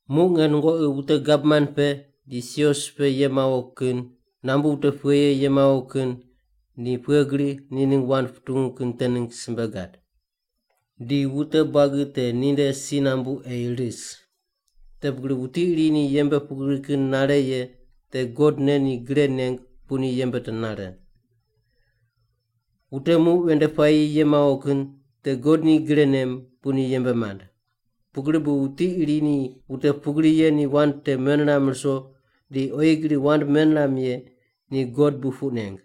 Muq nge nungoqi wute gavman pe, di sios pe ye mawo kin, nambu wute pughe ye ye mawo kin, ni pughe gri ni ningg wand putungu kin te ningg simbe gad. Di wute buagi te ninde si nambu ei ris. Te pugri wuti iri ni yembe pugri kin nare ye te God ne ni gre neng bu ni yembe te nare. Wute muq ven nde puayi ye mawo kin te God ni gre nem bu ni yembe mand. Pugri bu wuti iri ni wute pugri ye ni wand te meniram ruso di oyi gri wand meniram ye ni God bu puq neng.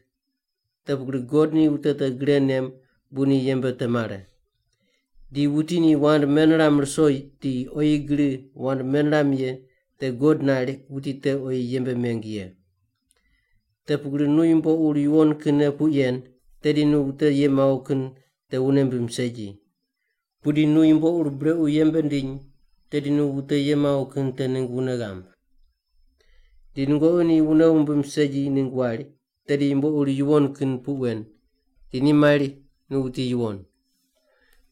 Te pugri God ni wute te gre nem bu ni yembe te mare. Di wuti ni wand meniram ruso di oyi gri wand meniram ye te God nari wuti te oyi yembe meng ye. Te pugri nu yumbo ur yuwon kinne puq yen, tedi nu wute ye mawo kin te wune mbim segi. Pudi nu yumbo ur brequ yembe ndiny tedi nu wute ye mawo kin te ningg wune ghamb. Di nungoqi ni wune wumbim segi ningg wari, tedi yumbo ur yuwon kin puq wen, di ni mari nu wuti yuwon.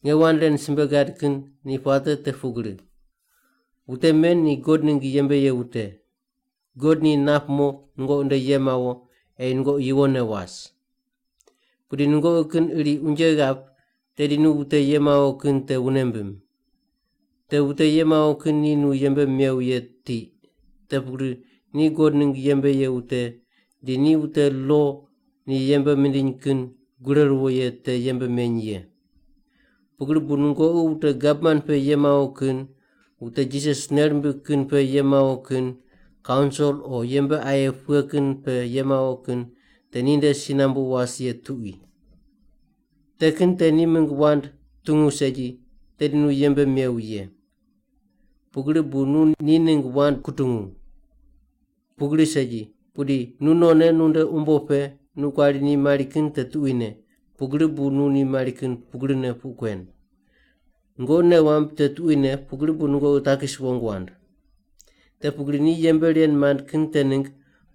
Nge wand ren simbe gad kin ni puate te pugri: Wute men ni God ningg yembe ye wute, God ni nap mo nungoqi nde ye mawo, ei nungoqi yuwonne was. Pudi nungoqi kin iri unje ghap tedi nu wute ye mawo kin te wune mbim. Te wute ye mawo kin ni nu yembe mew ye tiq, te pugri ni God ningg yembe ye wute di ni wute lo ni yembe mindiny kin gure ruwo ye te yembe meny ye. Pugri bu nungoqi wute gavman pe ye mawo kin, wute Jisas nei rimbig kin pe ye mawo kin, kaunsil o yembe aye pughe kin pe ye mawo kin te ninde si nambu was ye tuqui. Te kin te ni mingg wand tungu segi, tedi nu yembe mew ye, pugri bu nu ni ningg wand kutungu. Pugri segi, pudi nu nonne nunde umbo pe nu kuari ni mari kin te tuquine, pugri bu nu ni mari kin pugrine puq kuen. Nungoqi nei wamb te tuquine pugri bu nungoqi takis wong wand. Te pugri ni yembe ren mand kin te ningg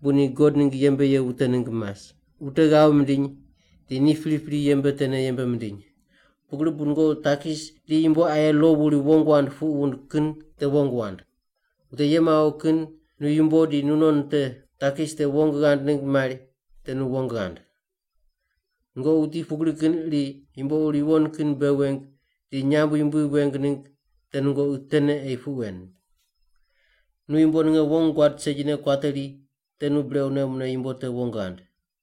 bu ni God ningg yembe ye wute ningg mas, wute ghav mindiny di ni pripri yembe tene yembe mindiny. Pugri bu nungoqi takis di yumbo aye lo wuri wong wand puq wund kin te wong wand. Wute ye mawo kin nu yumbo di nunon te takis te wong ghand ningg mari te nu wong ghand. Nungoqi wuti pugri kin iri yumbo ur yuwon kin bei weng di nyamb yumbui weng ningg te nungoqi tene ei puq wen. Nu yumbo ninge wong guad segine kuateri te nu brequne mune yumbo te wong ghand.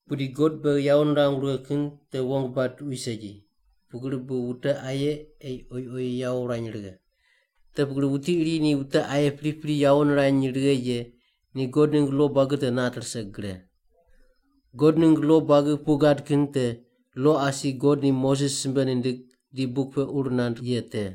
Pudi God beghi yawo nirangu righe kin te wong bad tuqui segi, pugri bu wute aye ei oyi oyi yawo wurany righe. Te pugri wuti iri ni wute aye priprine yawo nirany righe ye, ni God ningg lo buagi te nat rise gre. God ningg lo buagi puq gad kin te lo asi God ni Moses simbe nindig di buk pe ur nand ye te.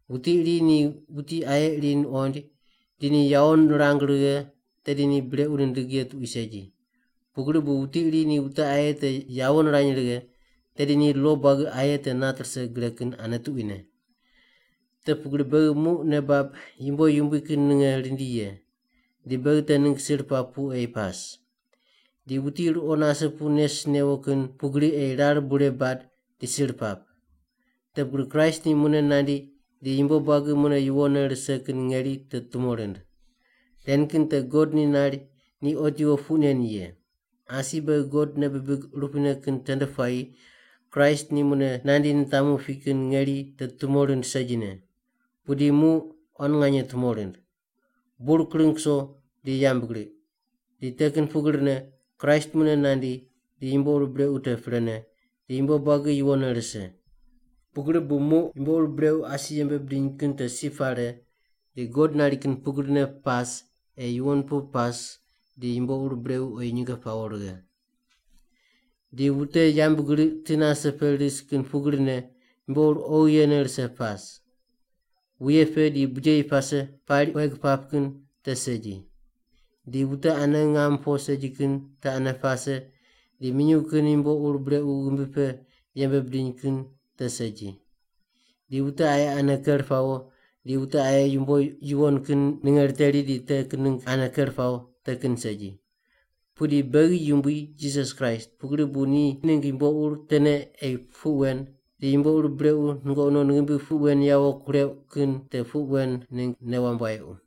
Wuti iri ni wuti aye iri nuqoind di ni yawo nirang righe, tedi ni brequ nindig ye tuqui segi. Pugri bu wuti ni wute aye te yawo nirany righe, tedi ni lo buagi aye te nat rise gre kin ane tuquine. Te pugri beghi muq nei bab yumbo yumbui kin ninge rindi ye, di beghi te ningg sir pap pu ei pas. Di wuti ruqo nase pu nes newo kin pugri ei rar bure bad di sir pap. Te pugri Kraist ni mune nandi di yumbo buagi mune yuwonne rise kin ngeri te tumo rind. Ren kin te God ni nari ni otiwo puq nen ye. Asi beghi God nei bibig urupuine kin tende puayi Kraist ni mune nandi nitamu pi kin ngeri te tumo rind segine. Pudi muq quan nganye tumo rind. Bur kring kuso, di yambgriq, di te kin pugrine Kraist mune nandi di yumbo ur brequ te prene, di yumbo buagi yuwonne rise. Pugri bu muq yumbo ur brequ asi yembe bidiny kin te si pare di God nari kin pugrine pas ei yuwon pu pas di yumbo ur brequ oyi nyinge pawo righe. Di wute yambgriq ti nase pe ris kin pugrine yumbo ur oghi yene rise pas. Wuye pe di bijeyi pase pari, queg pap kin te segi. Di wute ane ngam po segi kin te ane pase, di minyuw kin yumbo ur brequ ghimbi pe yembe bidiny kin te segi. Di wute aye ane ker pawo, di wute aye yumbo yuwon kin ninge riteri di te kin ningg ane ker pawo, te kin segi. Pudi beghi Yumbui Jisas Kraist pugri bu ni ningg yumbo ur tene ei puq wen di yumbo ur brequ nungoqi non ghimbi pe puq wen yawo kureuq kin te puq wen ningg nei wamb wayequ.